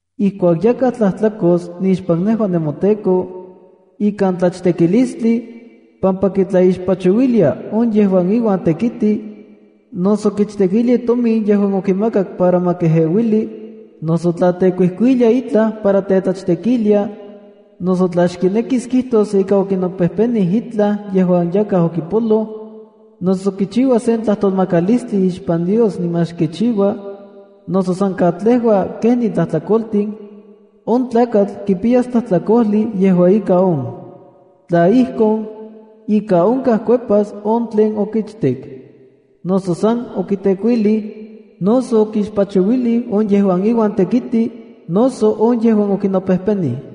“Ijkuak yakaj tlajtlakos nixpan nejua nemoTEKO, ikan tlachtekilistli, pampa kitlaixpachouilia on yejuan iuan tekiti, noso kichtekilia itomin yejuan okimakaka para ma kejeuili, noso tla tekuijkuilia itlaj para tetlachtekilia, noso tla xkinekis kijtos ika okinopejpenij itlaj yejuan yakaj okipoloj, noso kichiua sen tlajtolmakalistli ixpan Dios niman xkichiua, noso san katlejua kenin tlajtlakoltin, on tlakatl kipiyas tlajtlakojli yejua ika on. Tla ijkon, ika onkaj kuepas on tlen okichtek, noso san okitekuilij, noso okixpachuilij on yejuan iuan tekiti, noso on yejuan okinopejpenij.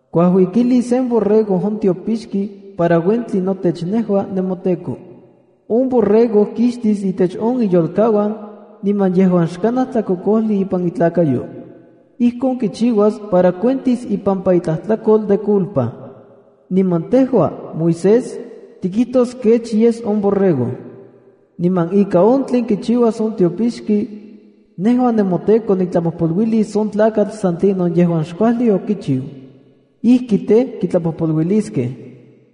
Kuajuikilis sen borrego on tiopixki para uentli notech nejua nemoTEKO. On borrego kixtis itech iyolkauan, niman yejuan xkanaj tlakokojli ipan itlakayo. Ijkon kichiuas para kiuentis ipampa itlajtlakol de culpa. Niman tejua, Moisés, tikijtos kech yes on borrego. Niman ika on tlen kichiuas on tiopixki, nejua nemoTEKO niktlapojpoluilis on tlakatl san tlinon yejuan xkuajli okichiu. Ijki tej, kitlapojpoluiliskej.”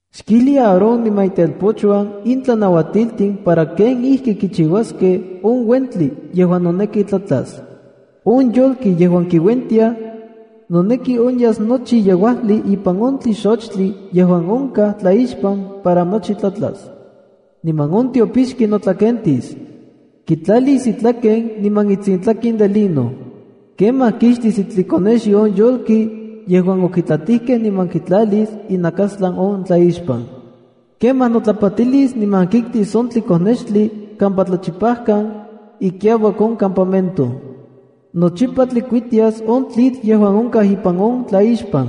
“Xkijli Aarón niman itelpochuan in tlanauatiltin para kenijki kichiuaskej on uentli yejuan noneki tlatlas. On yolki yejuan kiuentiaj, noneki onyas nochi yejuajli ipan on tlixochtli yejuan onkaj tlaixpan para nochi tlatla. Niman on tiopixki notlakentis. Kitlalis itlaken niman itsintlaken de lino. Kemaj kixtis itlikonexyo on yolki yejuan okitlatijkej niman kitlalis inakastlan on tlaixpan. Kemaj notlapatilis niman kiktis on tlikonextli kampa tlachipajkan, ikiauak on campamento. “Nochipa tlikuitias on tlitl yejuan onkaj ipan on tlaixpan.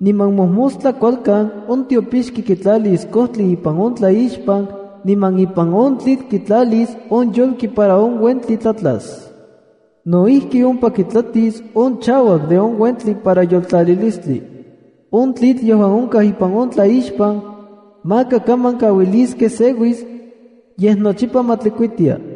Niman mojmostla kualkan on tiopixki kitlalis kojtli ipan on tlaixpan niman ipan on tlitl kitlalis on yolki para on uentli tlatlas. No ijki, ompa kitlatis on chauak de on uentli para yoltlalilistli. On tlitl yejuan onkaj ipan on tlaixpan, maka kaman kauiliskej seuis, yej nochipa ma tlikuitia.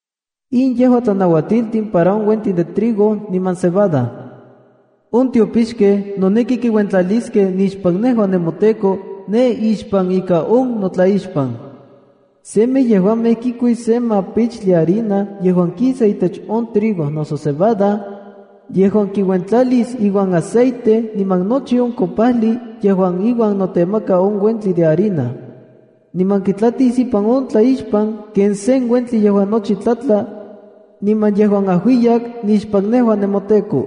’In yejua tlanauatiltin para on uentin de trigo niman cebada. On tiopixkej noneki kiuentlaliskej nixpan nejua nemoTEKO ne ixpan ika on notlaixpan. Semej yejuamej kikuis se mapichtli harina yejuan kisa itech on trigo noso cebada, yejuan kiuentlalis iuan aceite niman nochi on kopajli yejuan iuan notemaka on uentli de harina. Niman kitlatis ipan on tlaixpan ken sen uentli yejuan nochi tlatla, niman yejuan ajuiyak nixpan nejua nemoTEKO.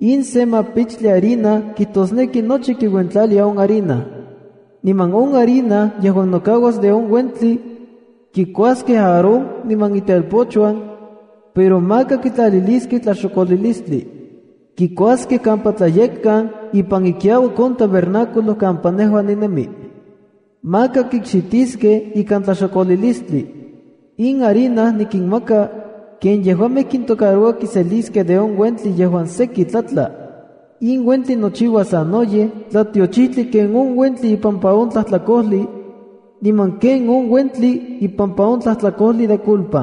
In se mapichtli harina kijtosneki nochi kiuentlalia on harina. Niman on harina yejuan nokauas de on uentli, kikuaskej Aarón niman itelpochuan, pero maka kitlaliliskej tlaxokolilistli. Kikuaskej kampa tlayekkan ipan ikiauak on tabernáculo kampa nejua ninemi. Maka kikxitiskej ikan tlaxokolilistli. In harina nikinmaka, ken yejuamej kintocaroua kiseliskej de on uentli yejuan seki tlatla. In uentli nochiuas sanoyej tlatiochijtli ken on uentli ipampa on tlajtlakojli, niman ken on uentli ipampa on tlajtlakojli de culpa.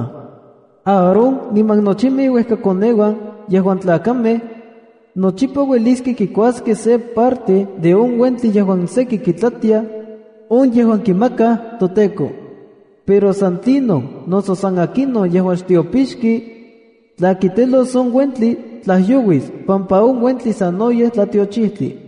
Aarón iuan nochimej iuejkakoneuan yejuan tlakamej, nochipa uelis kikuaskej se parte de on uentli yejuan seki kitlatiaj, on yejuan kimakaj toTEKO. Pero san tlinon noso san akinon yejuan xtiopixki, tla kitelos on uentli tlajyouis pampa on uentli sanoyej tlatiochijtli.”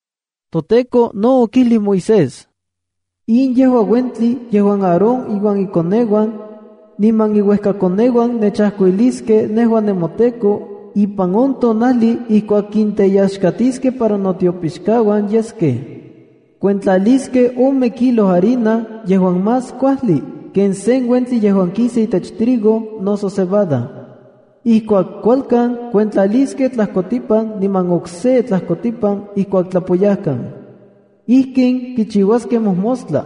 ToTEKO no okijli Moisés: “In yejua uentli yejuan Aarón iuan ikoneuan, niman iuejkakoneuan nechajkuiliskej nejua nemoTEKO ipan on tonajli ijkuak kinteyaxkatiskej para notiopixkauan yeskej. Kuentlaliskej ome kilo harina yejuan más kuajli ken se uentli yejuan kisa itech trigo noso cebada. Ijkuak kualkan kuentlaliskej tlajkotipan niman okse tlajkotipan ijkuak tlapoyajkan. Ijkin kichiuaskej mojmostla.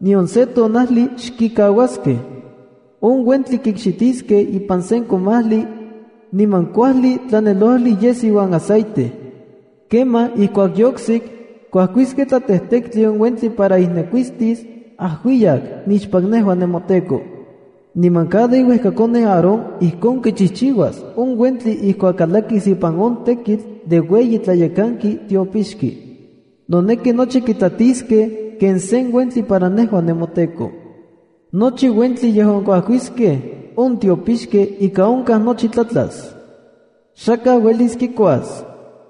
Nion se tonajli xkikauaskej. On uentli kikxitiskej ipan sen komajli, niman kuajli tlanelojli yes iuan aceite. Kemaj ijkuak yoiksik, kuajkiskej tlatejtektli on uentli para ijnekuistis ajuiyak nixpan nejua nemoTEKO. Niman cada iuejkakoneu Aarón ijkon kichijchiuas on uentli ijkuak kalakis ipan on tekitl de ueyi tlayekanki tiopixki. Noneki nochi kitlatiskej ken se uentli para nejua nemoTEKO. Nochi uentli yejuan kuajkiskej on tiopixkej ika onkaj nochi tlatlas. Xakaj uelis kikuas.”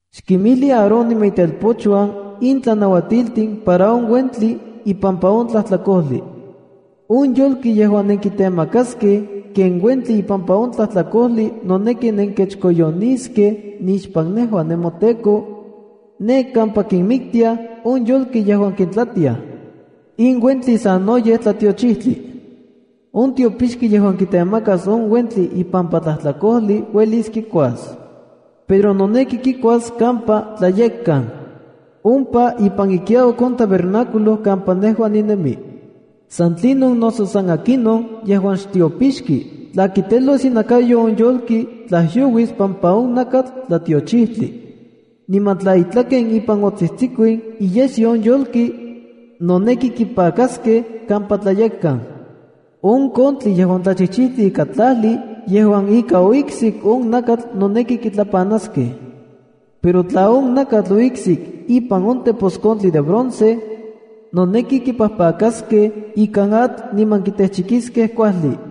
“Xkimijli Aarón niman itelpochuan in tlanauatiltin para on uentli ipampa on tlajtlakojli. On yolki yejuan nenkitemakaskej ken uentli ipampa on tlajtlakojli noneki nenkechkoyoniskej nixpan nejua nemoTEKO, ne kampa kinmiktiaj on yolkej yejuan kintlatiaj. In uentli sanoyej tlatiochijtli. On tiopixki yejuan kitemakas on uentli ipampa tlajtlakojli uelis kikuas. Pero noneki kikuas kampa tlayekkan, ompa ipan ikiauak on tabernáculo kampa nejua ninemi. San tlinon noso san akinon yejuan xtiopixki tla kitelos inakayo on yolki tlajyouis pampa on nakatl tlatiochijtli. Niman tla itlaken ipan otsijtsikuin iyesyo on yolki, noneki kipakaskej kampa tlayekkan. On kontli yejuan tlachijchijtli ika tlajli yejuan ika oiksik on nakatl noneki kitlapanaskej. Pero tla on nakatl oiksik ipan on teposkontli de bronce, noneki kipajpakaskej ikan atl niman kitejchikiskej kuajli.